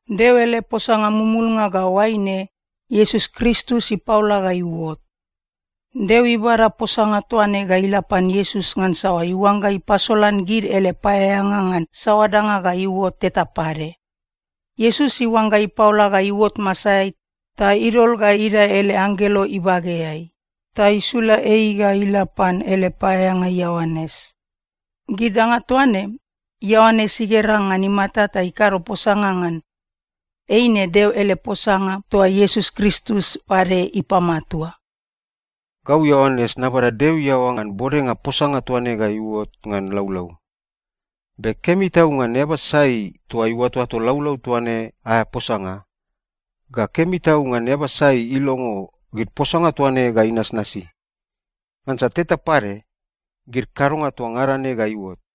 Deo ele posanga mumulnga ga oaine, Iesus Kristus ipaola ga iuot. Deo ibada posanga toa ne ga ila pan Iesus ngansa iuangga ipasolan gid ele paeaeanga ngan saoa danga ga iuot teta pade. Iesus iuangga ipaola ga iuot masaeai, ta idol ga idae ele anggelo ibageai, ta isula ei ga ila pan ele paeaeanga Ioanes. Gid danga toa ne, Ioanes igera ngan imata ta ikado posanga ngan. Eine Deo ele posanga toa Iesus Kristus pade ipamatua. Gau Ioanes nabada Deo iaoa ta nabode posanga toa ne ga idae ngan laulau. Be kemi tau ngan eaba sai toa iuatoato laulau toa ne aea posanga, ga kemi tau ngan eaba sai ilongo gid posanga toa ne ga inasnasi. Ngansa teta pade, gid kadonga toa ngada ne ga iuot.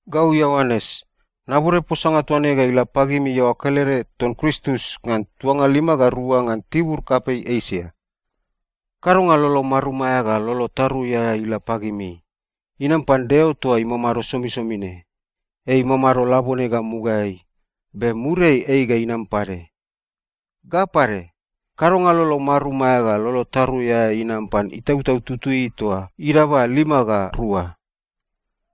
Gau Ioanes, nabode posanga toa ne ga ila pagimi iaoa kelede ton Kristus ngan tuanga lima ga rua ngan tibur kapei Esia. Kadonga lolo marum aea ga lolo tarui aea ila pagimi. Inam pan Deo toa imamado somisomi ne. Ei imamado labone ga mugaeai, be muriai ei ga inam pade. Ga pade, kadonga lolo marum aea ga lolo tarui aea inam pan Itautau Tutui toa idaba lima ga rua.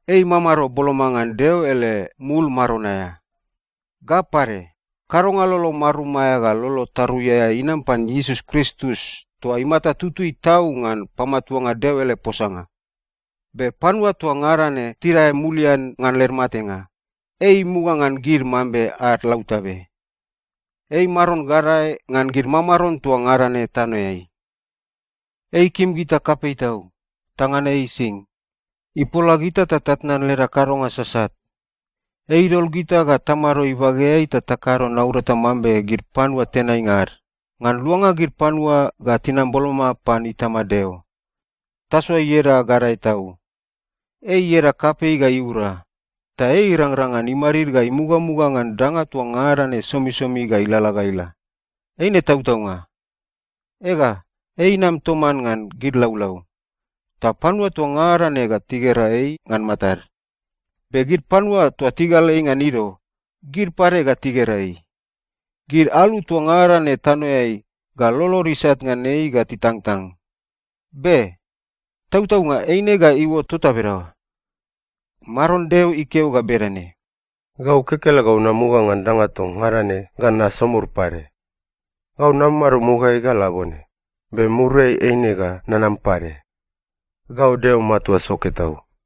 Ei imamado boloma ngan Deo ele mul maron aea. Ga pade, kadonga lolo marum aea ga lolo tarui aea inam pan Iesus Kristus toa imata tutui tau ngan pamatuanga Deo ele posanga. Be panua toa ngada ne tidae mulian ngan led matenga, ei imuga ngan gid mambe ad lautabe. Ei Maron gadae ngan gid mamaron toa ngada ne tanoeai. Ei ikim gita kapei tau, ta ngan ei ising, ipola gita ta tatnan leda kadonga sasat. Ei idol gita ga tamado ibageai ta takado naurata mambe gid panua tenainga ad, ngan luanga gid panua ga tinam boloma pan Itama Deo. Tasoa ieda gadae tau. Ei ieda kapei ga iura, ta ei irangrang ngan imadid ga imugamuga ngan danga toa ngada ne somisomi ga ilalala ga ila. Eine tautaunga. Ega, ei inam toman ngan gid laulau. Ta panua toa ngada ne ga tigera ei ngan matad. Be gid panua toa tigal ei ngan ido, gid pade ga tigera ei. Gid alu toa ngada ne tanoeai ga lolod isat ngan ei ga titangtang. Be. Tautaunga eine ga iuot tota bedaoa. Maron Deo ikeo ga bedane, “Gau kekelegau namuga ngan danga toa ngada ne ga nasomur pade. Gau namamado mugaeai ga labone, be muriai eine ga nanam pade. Gau Deo Matua Soke Tau.”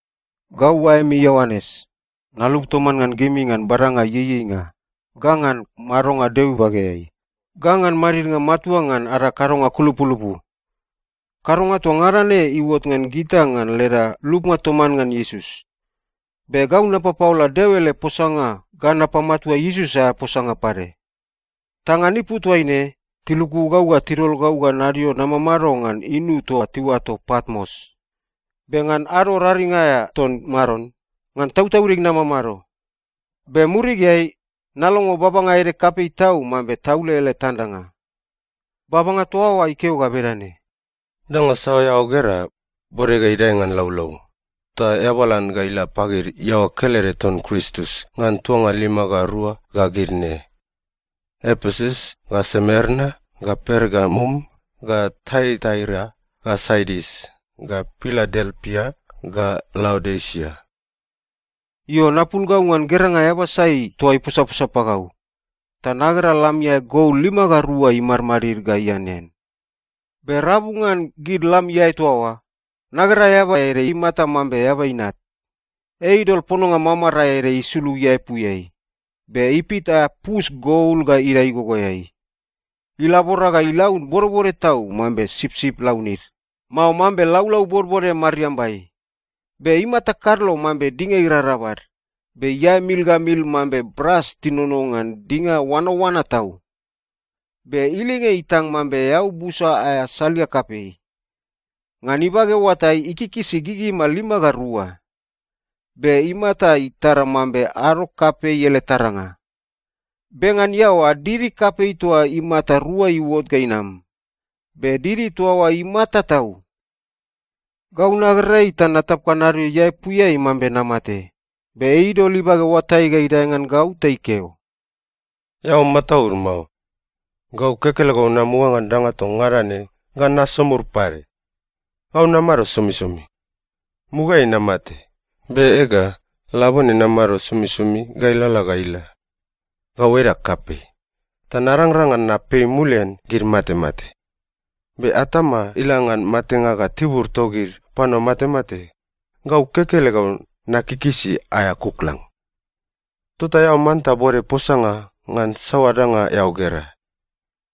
Gau oaemi Ioanes, nalup toman ngan gimi ngan badanga ieieinga, ga ngan madonga Deo ibageai, ga ngan madidnga matua ngan ada kadonga kulupulupu. Kadonga toa ngada ne iuot ngan gita ngan leda lupnga toman ngan Iesus. Be gau napapaola Deo ele posanga ga napamatua Iesus aea posanga pade. Ta ngan ipu toaine, tiluku gau ta tidol gau ga nadio namamado ngan inu toa tiuato Patmos. Be ngan ado raring aea ton Maron, ngan tautaudig namamado. Be murigeai, nalongo babanga ede kapei tau mambe taule ele tandanga. Babanga toa oa ikeo ga bedane, “Danga saoa eao gera, bode ga idae ngan laulau, ta eabalan ga ila pagid iaoa kelede ton Kristus ngan tuanga lima ga rua ga gid ne: Epesus ga Semerna ga Pergamum ga Taiataira ga Sardis ga Piladelpia ga Laodisia.” Io, napul gau ngan geranga eaba sai toa iposaposa pagau, ta nagera lam iae gol lima ga rua imadmadid ga ianean. Be rabu ngan gid lam iae toa oa, nagera eaba ede imata mambe Eaba Inat. Ei idol pononga mamarae ede isulug iaepuiai. Be ipit aea pus gol ga idae igogoeai. Ilabora ga ilaun bodbode tau mambe sipsip launid, mao mambe laulau bodbode mariambai. Be imata kadlo mambe dinga irarabal. Be iae mil ga mil mambe bras tinono ngan dinga oanaoana tau. Be ilinge itang mambe eau busa aea salia kapei. Ngan ibage oatai, ikikisi gigima lima ga rua. Be imata itara mambe ado kapei ele taranga. Be ngan iaoa, didi kapei toa imata rua iuot ga inam. Be didi toa oa imata tau. Gau nagera ei ta natap ga nadio iaepuiai mambe namate. Be ei idol ibage oatai ga idae ngan gau ta ikeo, “Eao mataud mao. Gau kekelegau namuga ngan danga toa ngada ne ga nasomur pade. Gau namamado somisomi. Mugaeai namate, be ega, labone namamado somisomi ga ilalala ga ila. Gau edag kapei ta narangrang ngan napei mulian gid matemate. Be atama ila ngan Matenga ga Tibur togid Panua Matemate, gau kekelegau nakikisi aea kuklang. “Tota eao manta bode posanga ngan saoa danga eao gera.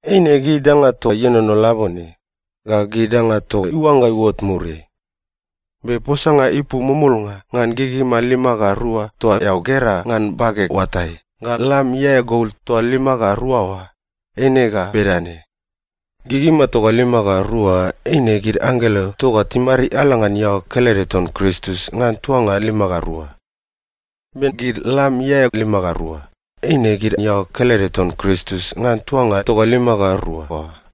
Eine gid danga toa ienono labone, ga gid danga toa iuangga iuot muriai. Be posanga ipu mumulnga ngan gigima lima ga rua toa eao gera ngan bageg oatai ga lam iae gol toa lima ga rua oa, eine ga bedane: Gigima toa lima ga rua oa eine gid anggelo toa timariala ngan iaoa kelede ton Kristus ngan tuanga lima ga rua. Be gid lam iae lima ga rua, eine gid iaoa kelede ton Kristus ngan tuanga toa lima ga rua oa.”